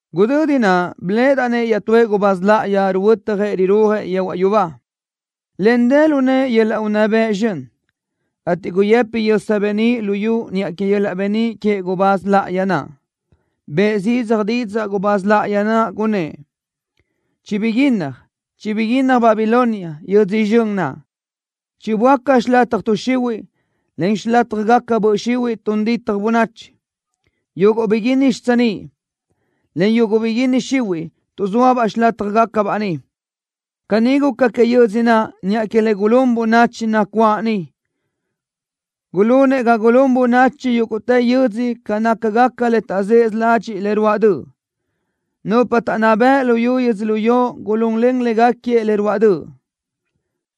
Gudödi naʼ biléʼedaʼ-nëʼ iaʼtúëʼ gubáz láʼayi ruhuötjëʼ rirúajëʼ yehuaʼ yubá, en dë lu nëʼë yöl-laʼ unná bëʼ zxön, ateʼ guyëpi yösa beníʼ luyú niʼa que yöl-laʼ beníʼ queëʼ gubáz láʼayi naʼ. Bëʼë zidzaj didzaʼ gubáz láʼayi naʼ, gunnë́ʼ: ¡Chibiguínnaj! ¡Chibiguínnaj Babilonia, yödzö zxön naʼ! ¡Chiböáca xilataj tuʼ xihuiʼ, en xilátjagaca böʼ xihuiʼ tun ditaj bönachi! ¡Yuguʼ biguínni xitsiníʼ, en yuguʼ biguínni xihuiʼ tuʼzóabaʼ xilátajgacabaʼ niʼ! Caní guca que yödzö naʼ niʼa que le gulún bönachi nacuáʼ niʼ. Gulunëʼ ga gulún bönachi yúguʼtë yödzö ca nácagaca le taʼzësö ladxiʼ le ruáʼ döʼ. Nupa taʼnná bëʼ luyú yödzölió gulunlen légaquiëʼ le ruáʼ döʼ,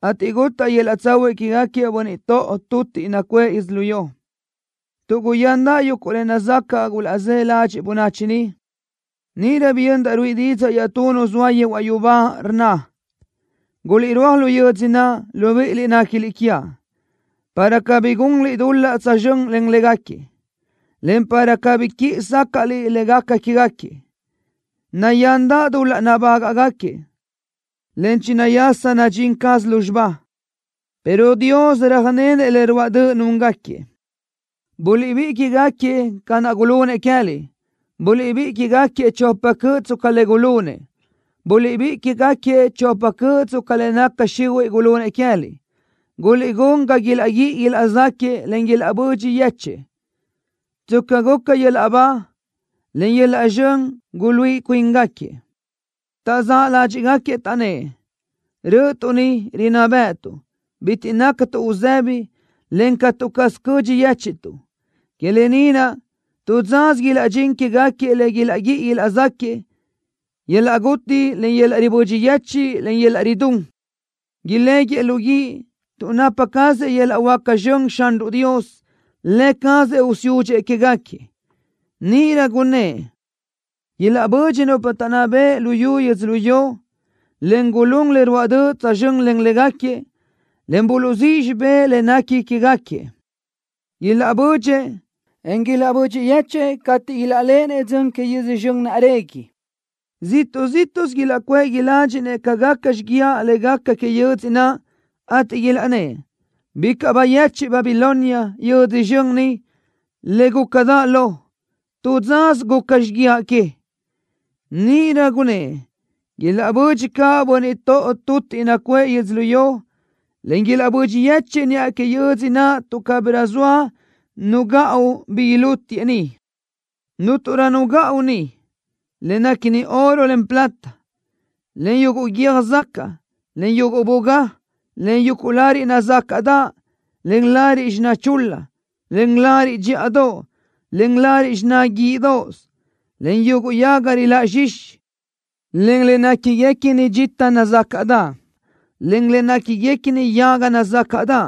ateʼ gutaʼ yöl-laʼ tsahuiʼ quégaquiëʼ bönniʼ toʼo tutiʼ nacuʼë yödzölió tuʼ guyándaʼ yuguʼ le nazacaʼ gulaʼzë́ ladxiʼ bönachi niʼ. Níʼirö biyöndaʼ ruíʼi didzaʼ iaʼtú nu zoa yehuaʼ yubá, rnna: Guliʼrúaj lu yödzö naʼ, libíʼiliʼ néquiliʼ quiaʼ para cabí gunliʼ dul-laʼ tsözxö́n len légaquiëʼ, en para cabí quíʼi sácaʼliʼ le gaca quégaquiëʼ. Nayándaʼ dul-laʼ nabágaʼgaquiëʼ, en chinayasa nadxín caz lúzxiba, pero Dios röjnenëʼ le ruáʼ döʼ núngaquiëʼ. Buliʼbíʼi quégaquiëʼ ca naʼ gulunëʼ queë́liʼ. Buliʼbíʼi quégaquiëʼ chopa cöʼ tsca le gulunëʼ. Buliʼbíʼi quégaquiëʼ chopa cöʼ tsca le naca xihuiʼ gulunëʼ queë́liʼ. Guliʼgún ga ilaʼguíʼi ilaʼzáquiëʼ, en ilaʼbödxi yéchëʼë tsca guca yöl-laʼ ba, en yöl-laʼ zxön guluíʼi cuíngaquiëʼ. Taʼzáʼ ládxiʼgaquiëʼ, taʼnnë́ʼ: Rö́ʼötuʼ ni, rinná bë́ʼëtuʼ. Bitiʼ nácatuʼ uzëbi, en catu caz cödxi yéchiʼtuʼ. Que lë ni naʼ, tu dzasö ilaʼdxín quégaquiëʼ le ilaʼguíʼi ilaʼzáquiëʼ, yöl-laʼ guti, en yöl-laʼ ribödxi yechiʼ, en yöl-laʼ ridún. Iléguiëʼ lu guíʼ, tuʼ napa cazëʼ yöl-laʼ huáca zxön Xanruʼ Dios. Lë cazëʼ usiúdxëʼ quégaquiëʼ. Níʼirö gunnë́ʼ: “Ilaʼbödxi nupa taʼnná bëʼ luyú yödzölió, en gulún le ruáʼ döʼ tsözxö́n len légaquiëʼ, en buluʼzíʼ xibé le nequi quégaquiëʼ. Ilaʼbödxëʼ, en ilaʼbödxi yéchëʼë cateʼ ilaʼléʼenëʼ dzön que yödzö zxön naʼ régui. Ziʼtuʼ zíʼtuʼsö ilaʼcuʼë tuʼ iládxinëʼ ca gaca xíguiaʼ le gaca que yödzö naʼ, ateʼ ilaʼnnë́ʼ: ¡Bicaʼ bayechiʼ Babilonia, yödzö zxön ni, le gúcadaʼ lo! ¡Tu dzasö guca xíguiaʼ que!” Níʼirö gunnë́ʼ: “Ilaʼbödxëʼ caʼ bönniʼ toʼo tutiʼ nacuʼë yödzölió, en ilaʼbödxi yéchëʼë niʼa que yödzö naʼ tuʼ cabirö soa nu gaʼu bi ilútiʼë niʼ.” Cúnturö nu gaʼu niʼ: Le néquiguequini oro, en plata, en yuguʼ guiö́j zacaʼ, en yuguʼ bugá, en yuguʼ lariʼ nazácaʼdaʼ, en lariʼ xiná chul-la, en lariʼ dxíʼadoʼ, en lariʼ xiná guíʼidoʼos, en yuguʼ yaga riláʼ zxixi, en le néquiguequini dxita nazácaʼdaʼ, en le néquiguequini yaga nazácaʼdaʼ,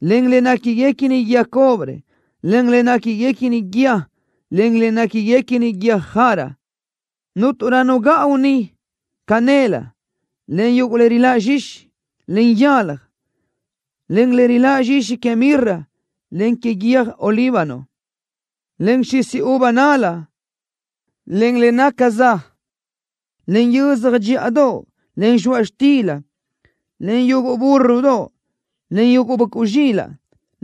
en le néquiguequini guíë cobre, en le néquiguequini guíë, en le néquiguequini guiö́j jara. Cúnturö nu gaʼu niʼ: Canel, en yuguʼ le riláʼ zxixi, en yalaj, en le riláʼ zxixi que mirra, en que yöj olíbano, en xisi uva nál-la, en le naca za, en yiözja dxíʼadoʼ, en zxoaʼ xtila, en yuguʼ búrrodoʼ, en yuguʼ böʼcuʼ zxilaʼ,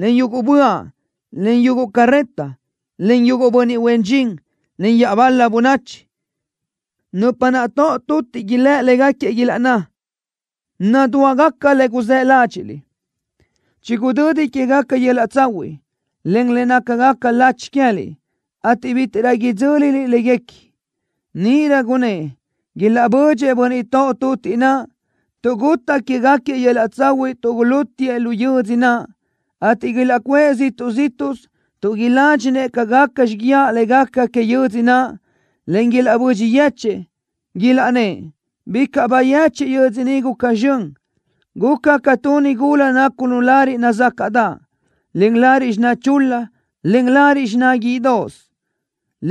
en yuguʼ böaʼ, en yuguʼ carreta, en yuguʼ bönniʼ huen dxin, en iaʼbal-la bönachi. Nupa naʼ toʼo tutiʼ ilë́ légaquiëʼ, ilaʼnná: Nadúagaca le guzë́ ládxiʼliʼ. Chigudödi quégaca yöl-laʼ tsahuiʼ, en le nácagaca lachi queë́liʼ, ateʼ bítiʼrö idzö́liliʼ léguequi. Níʼirö gunnë́ʼ: “Ilaʼbödxëʼ bönniʼ toʼo tutiʼ naʼ, tuʼ gutaʼ quégaquiëʼ yöl-laʼ tsahuiʼ tuʼ gulútiʼë lu yödzö naʼ, ateʼ ilaʼcuʼë ziʼtuʼ zíʼtuʼsö tuʼ iládxinëʼ ca gaca xíguiaʼ le gaca que yödzö naʼ, en ilaʼbödxi yéchëʼë.” Ilaʼnnë́ʼ: ¡Bicaʼ bayechiʼ yödzö ni guca zxön! Guca ca tu nigula nácunu lariʼ nazácaʼdaʼ, en lariʼ xiná chul-la, en lariʼ xiná guíʼidoʼos,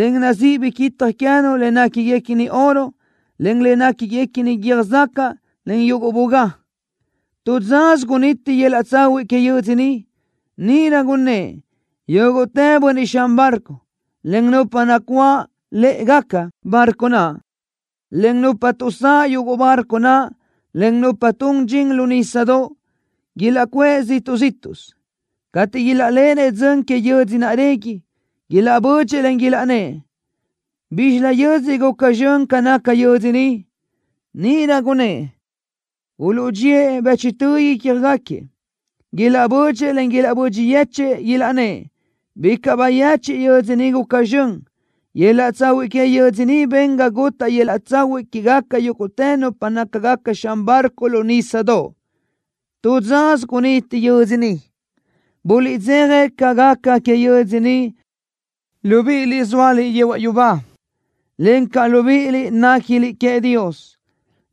en nazíʼi biquitaj queë́nu le néquiguequini oro en le néquiguequini guiö́j zacaʼ, en yuguʼ bugá. Tu dzasö guniti yöl-laʼ tsahuiʼ que yödzö ni. Níʼirö gunnë́ʼ: “Yúguʼtë bönniʼ xan barco, en nupa nacuáʼ lë́ʼegaca barco naʼ, en nupa tuʼsáʼ yuguʼ barco naʼ, en nupa tun dxin lu nísadoʼ, ilaʼcuʼë ziʼtuʼ zíʼtuʼsö.” Cateʼ ilaʼléʼenëʼ dzön que yödzö naʼ régui, ilaʼbödxëʼ, en ilaʼnnë́ʼ: “¿Bízxilö yödzö guca zxön ca naca yödzö ni?” Níʼirö gunnë́ʼ: Uluʼdxíëʼ bëchtö ícjagaquiëʼ. Ilaʼbödxëʼ, en ilaʼbödxi yechë́ʼë, ilaʼnnë́ʼ. ¡Bicaʼ bayechiʼ yödzö ni guca zxön! Yöl-laʼ tsahuiʼ que yödzö ni ben ga gutaʼ yöl-laʼ tsahuiʼ quégaca yúguʼtë nupa nácagaca xan barco lu nísadoʼ. Tu dzasö guniti yödzö ni. Buliʼdzeja ca gaca que yödzö ni, libíʼiliʼ zóaliʼ yehuaʼ yubá, encaʼ libíʼiliʼ néquiliʼ queëʼ Dios,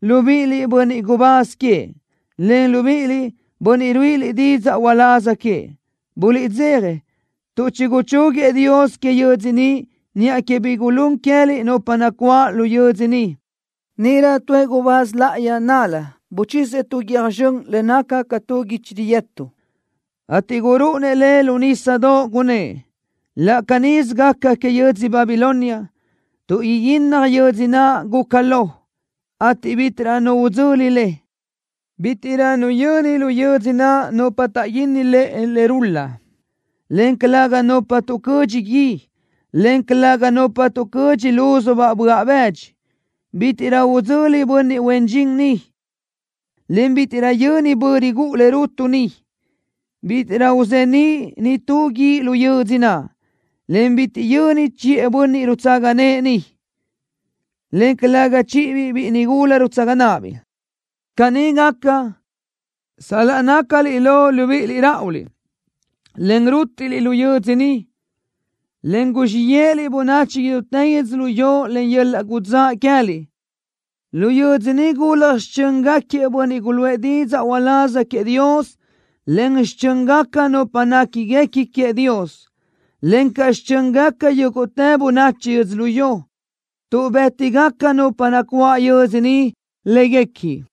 libíʼiliʼ, bönniʼ gubáz queëʼ, en libíʼiliʼ, bönniʼ ruíʼiliʼ didzaʼ uláz queëʼ. Buliʼdzeja, tuʼ chiguchúguiëʼ Dios que yödzö ni niʼa que bi gulún queë́liʼ nupa nacuáʼ lu yödzö ni. Níʼirö tuëʼ gubáz láʼayi nál-la buchisëʼ tu guiö́j zxön le naca ca tu guichi riyëtu, ateʼ gurúʼunëʼ le lu nísadoʼ, gunnë́ʼ: Laʼ canísö gaca que yödzö Babilonia, tuʼ iguínnaj yödzö naʼ guca lo, ateʼ bítiʼrö nu udzöli le. Bítiʼrö nu yöni lu yödzö naʼ nupa taʼguínni lëʼe le rul-la, en calëga nupa tuʼcödxi gui en calëga nupa tuʼcödxi lúzubaʼ böaʼ bëdxi. Bítiʼrö udzöli bönniʼ huen dxin niʼ, en bítiʼrö yöni bö rigúʼu le rutu niʼ. Bítiʼrö uzeníʼ nitú guíʼ lu yödzö naʼ, en bitiʼ yöni chiʼë bönniʼ rutsaga nëʼë niʼ, en calëga chíʼibiʼ biʼi nigula rutsaga náʼabiʼ. Caní gaca sal-laʼ nácaliʼ lo, libíʼiliʼ ráʼuliʼ, en rútiʼliʼ lu yödzö ni, en guzxíʼ yéʼeliʼ bönachi idútë yödzölió len yöl-laʼ gudzáʼ queë́liʼ. Lu yödzö ni gulaj xichö́ngaquiëʼ bönniʼ guluʼë didzaʼ uláz queëʼ Dios, en xichö́ngaca nupa néquiguequi queëʼ Dios, encaʼ xichö́ngaca yúguʼtë bönachi yödzölió, tuʼ bë́tigaca nupa nacuáʼ yödzö ni léguequi.